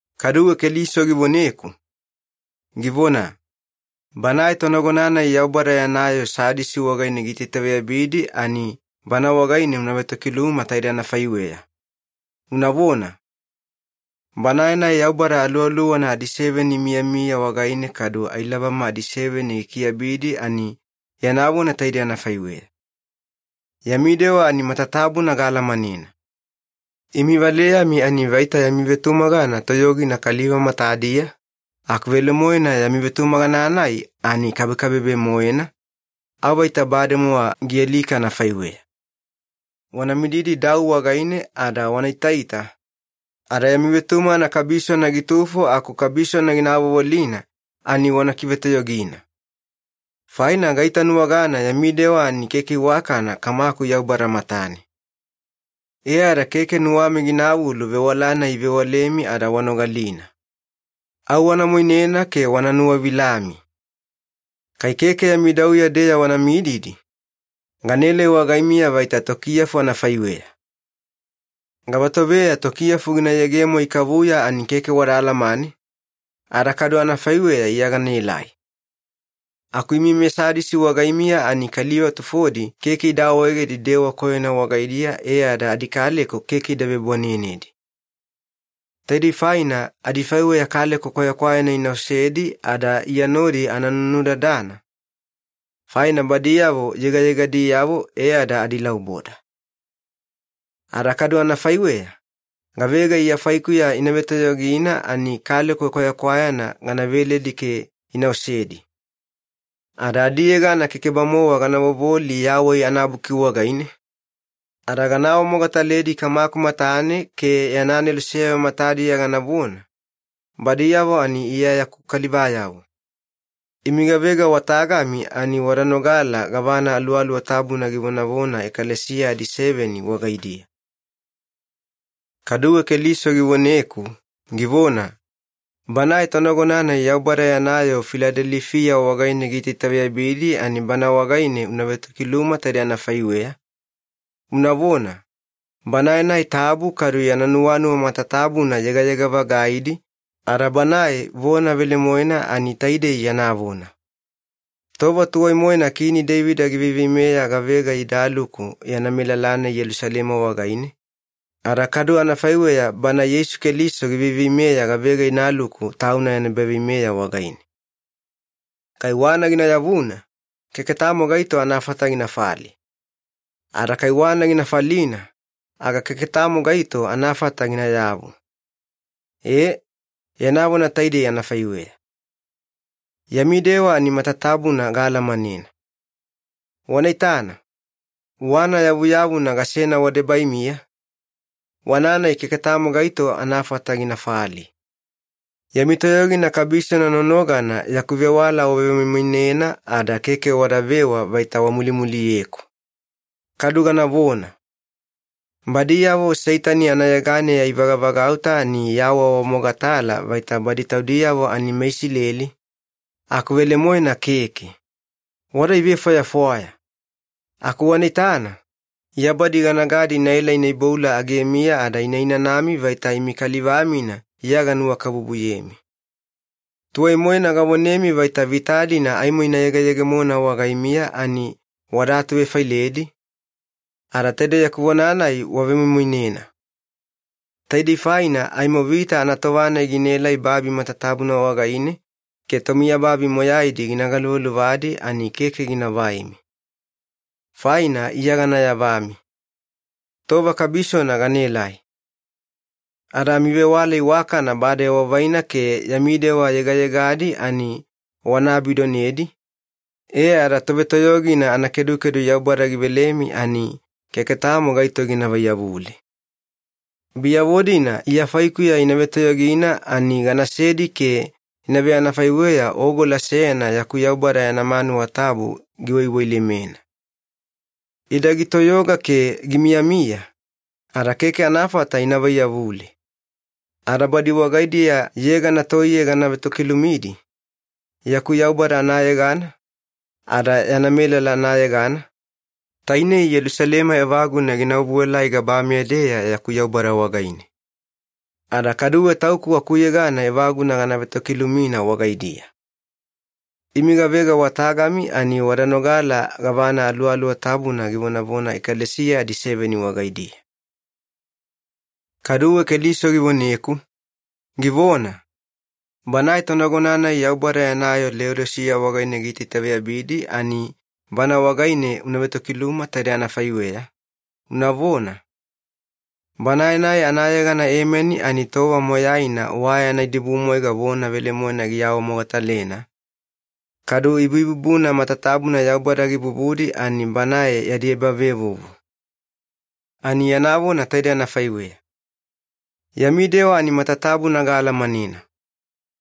Kaduwe Keliso givoneku, givona, “Banae tonagona-nai Yaubada yana yoo Sadisi wagaine giitaitaveyabidi ani bana wagaine una vetokiluma taide anafaiweya, unavona, ‘Banae-nai Yaubada Aluwaluwana adiseveni imiyamiya wagaine kadu ailabama adiseveni gikiabidi ani yana vona taidei anafaiweya. Yami dewa ani matatabuna gaalamanena. Imi valeyami ani vaita yami vetumagana toyogina kaliva matadiya, aku velemoena yami vetumagana-nai ani kabekabebe-moena, au vaita bademowa gialika anafaiweya. Wana mididi dau wagaine ada wana itaita, ada yami vetumagana kabisona gitufo aku kabisona gina avovolina, ani wana kivetoyogina. Faina gaitanuwagana yami dewa ani keke iwakana Kamaku Yaubada matane. E ada keke nuwami ginavulu vewala-nai ivewalemi ada wanogalina. Au wana moinena ke wana nuwavilami. Kai keke yami dauya-deya wana mididi, ganaelai wagaimiya vaita tokiyafu anafaiweya. Gavatoveya tokiyafu gina yegemo ikavuya ani keke wada alamane, ada kadu anafaiweya Iya ganaelai. Aku imi meSadisi wagaimiya ani kaliva tufodi keke ida awaegedi dewa koyona wagaidiya e ada adikaleko keke ida vebwanenedi. Taidei faina adifaiweya kaleko kwayakwayana ina osedi ada Iya nodi ana nunudadana, faina badiyavo yegayegadiyavo e ada adilauboda. Ada kadu anafaiweya, gavega Iya faikuya ina vetoyogina ani kaleko kwayakwayana gana veledi ke ina osedi. Ada adiyegana keke-bamowa gana vovoli Yawai anaBuki wagaine, ada gana awamogataledi Kamaku matane ke yana aneloseyavo matadiya ganavona, “Badiyavo ani Iya yaku kalivayavo.” Imi gavega wa tagami ani wada nogala gavana Aluwaluwa Tabuna givonavona ekalesiya adiseveni wagaidiya.’” Kaduwe Keliso givoneku, givona, “Banae tonagona-nai Yaubada yana yoo Filadelifiya wagaine giitaitaveyabidi, ani bana wagaine una vetokiluma taide anafaiweya, unavona, ‘Banae-nai tabu kadu yana nuwanuwa matatabuna yegayega-vagaidi ada Banae vona velemoena ani taidei yana vona. Tova tuwai-moena Kini Deivida giveiveimeya gavega idaluku yana melala-nai Yelusalema wagaine, ada kadu anafaiweya Bana Yeisu Keliso giveiveimeya gavega inaluku Tauna yana ebaveimeya wagaine. Kai wana gina yavuna, keke tamo gaito anafata ginafali. Ada kai wana gina falina, aga keke tamo gaito anafata ginayavu. Ee, yana vona taidei anafaiweya. Yami dewa ani matatabuna gaalamanena. Wana itana, wana yavuyavuna gasena wadebaimiya, wana-nai keke tamo gaito anafata ginafali. Yami toyogina kabisona nonogana yaku vewala wavemoimoinena ada keke wadavewa vaita wamulimuliyeku. Kadu ganavona. Badiyavo Seitani anayeganeya ivagavagauta ani iawaawamogatala vaita badi taudiyavo ani meIsileli, aku velemoena keke. Wada ivefwayafwaya. Aku wana itana, Iya badi ganagadi inaela ina iboula agemiya ada ina inanami vaita imi kaliva-mina Iya ganuwakabubuyemi. Tuwai-moena gavonemi vaita vita-dina aimo ina yegeyegemona wagaimiya ani wada atuvefailedi, ada taide yaku vona-nai wavemoimoinena. Taidei faina aimo vita anatova-nai ginaelai babi matatabuna wagaine ke tomiyababi moyaidi gina galuvaluvadi, ani keke gina vaimi. Faina Iya gana yavami. Tova kabisona ganaelai. Ada amivewala iwakana bade wavaina ke yami dewa yegayegadi ani wana abidonedi, e ada tovetoyogina anakedukedu Yaubada givelemi ani keke tamo gaito gina vaiyavule. Biyavo-dina Iya faikuya ina vetoyogina ani ganasedi ke ina veanafaiweya ogola seyana yaku Yaubada yana manuwa tabu giwaiwailemena. Ida gitoyoga ke gimiyamiya, ada keke anafata ina vaiyavule. Ada badi wagaidiya yegana toiye gana vetokilumidi, yaku Yaubada anayegana, ada yana melala anayegana, tainei Yelusalema evaguna gina obuelai gabameya-deya yaku Yaubada wagaine. Ada kaduwe Tauku akuyegana evaguna gana vetokilumina wagaidiya. Imi gavega wa tagami ani wada nogala gavana Aluwaluwa Tabuna givonavona ekalesiya adiseveni wagaidiya.’” Kaduwe Keliso givoneku, givona, “Banae tonagona-nai Yaubada yana yoo Leodisiya wagaine giitaitaveyabidi ani bana wagaine una vetokiluma taide anafaiweya, unavona, ‘Banae-nai anayegana Emeni ani tova moyaina wa yana idibumwaiga vona velemoena giawamogatalena, kadu ibuibubuna matatabuna Yaubada gibubudi ani Banae yadi ebavevuvu. Ani yana vona taidei anafaiweya. Yami dewa ani matatabuna gaalamanena.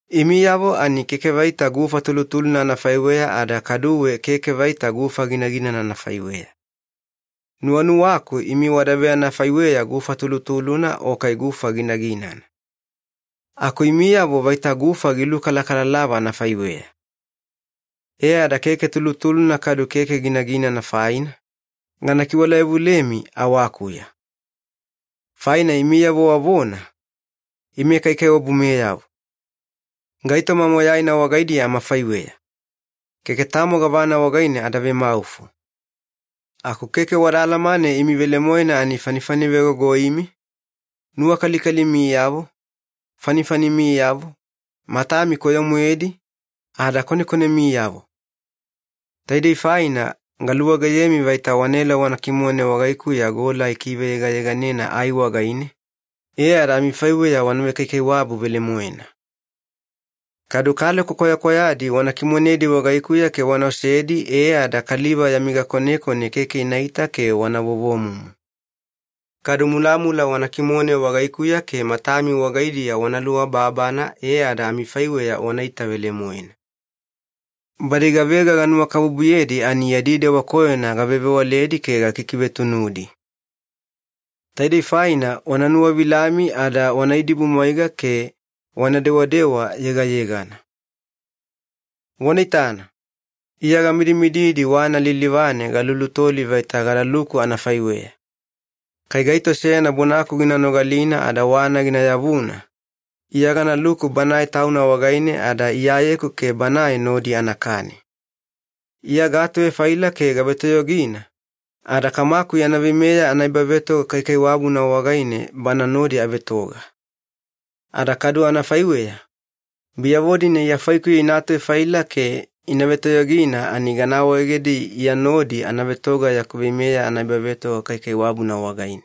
Imiyavo ani keke vaita gufa tulutuluna anafaiweya ada kaduwe keke vaita gufa ginaginana anafaiweya. Nuwanuwaku imi wada veanafaiweya gufa tulutuluna o kai gufa ginaginana. Aku imiyavo vaita gufa gilukalakalalava anafaiweya. E ada keke tulutuluna kadu keke ginaginana faina, gana kiwala yavulemi awakuya. Faina imiyavo wavona, “Ime kaikaiwabumeyavo. Gaitoma moyaina wagaidiya amafaiweya. Keke tamo gavana wagaine ada vemaufo.” Aku keke wada alamane imi velemoena ani fanifanivegogoimi, nuwakalikalimiyavo, fanifanimiyavo, matami koyo-moedi, ada konekonemiyavo. Taidei faina galuwageyemi vaita wanaela wana kimone wagaikuya gola ikiveyegayeganena ai wagaine, e ada amifaiweya wana vekaikaiwabu velemoena. Kadu kaleko kwayakwayadi wana kimonedi wagaikuya ke wana osedi e ada kaliva yami gakonekone keke inaita ke wana vovomumu. Kadu mulamula wana kimone wagaikuya ke matami wagaidiya wana luababana e ada amifaiweya wanaita velemoena. Badi gavega ganuwakabubuyedi ani yadi dewa koyona gavevewaledi ke gakikivetunudi. Taidei faina wana nuwavilami ada wana idibumwaiga ke wana dewadewa yegayegana. Wana itana, Iya gamidimididi wana lilivane galulutoli vaita gadaluku anafaiweya. Kai gaito seyana bonaku gina nogalina ada wana gina yavuna, Iya ganaluku banae tauna wagaine ada Iyayeku ke banae nodi anakani. Iya gaatuvefaila ke gavetoyogina, ada Kamaku yana veimeya anaebavetoga kaikaiwabuna wagaine Bana nodi avetoga. Ada kadu anafaiweya, biyavo-dina Iya faikuya ina atuvefaila ke ina vetoyogina ani gana awaegedi Iya nodi ana vetoga yaku veimeya anaebavetoga kaikaiwabuna wagaine.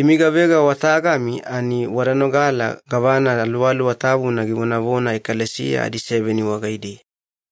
Imi gavega wa tagami ani wada nogala gavana Aluwaluwa Tabuna givonavona ekalesiya adiseveni wagaidiya.’”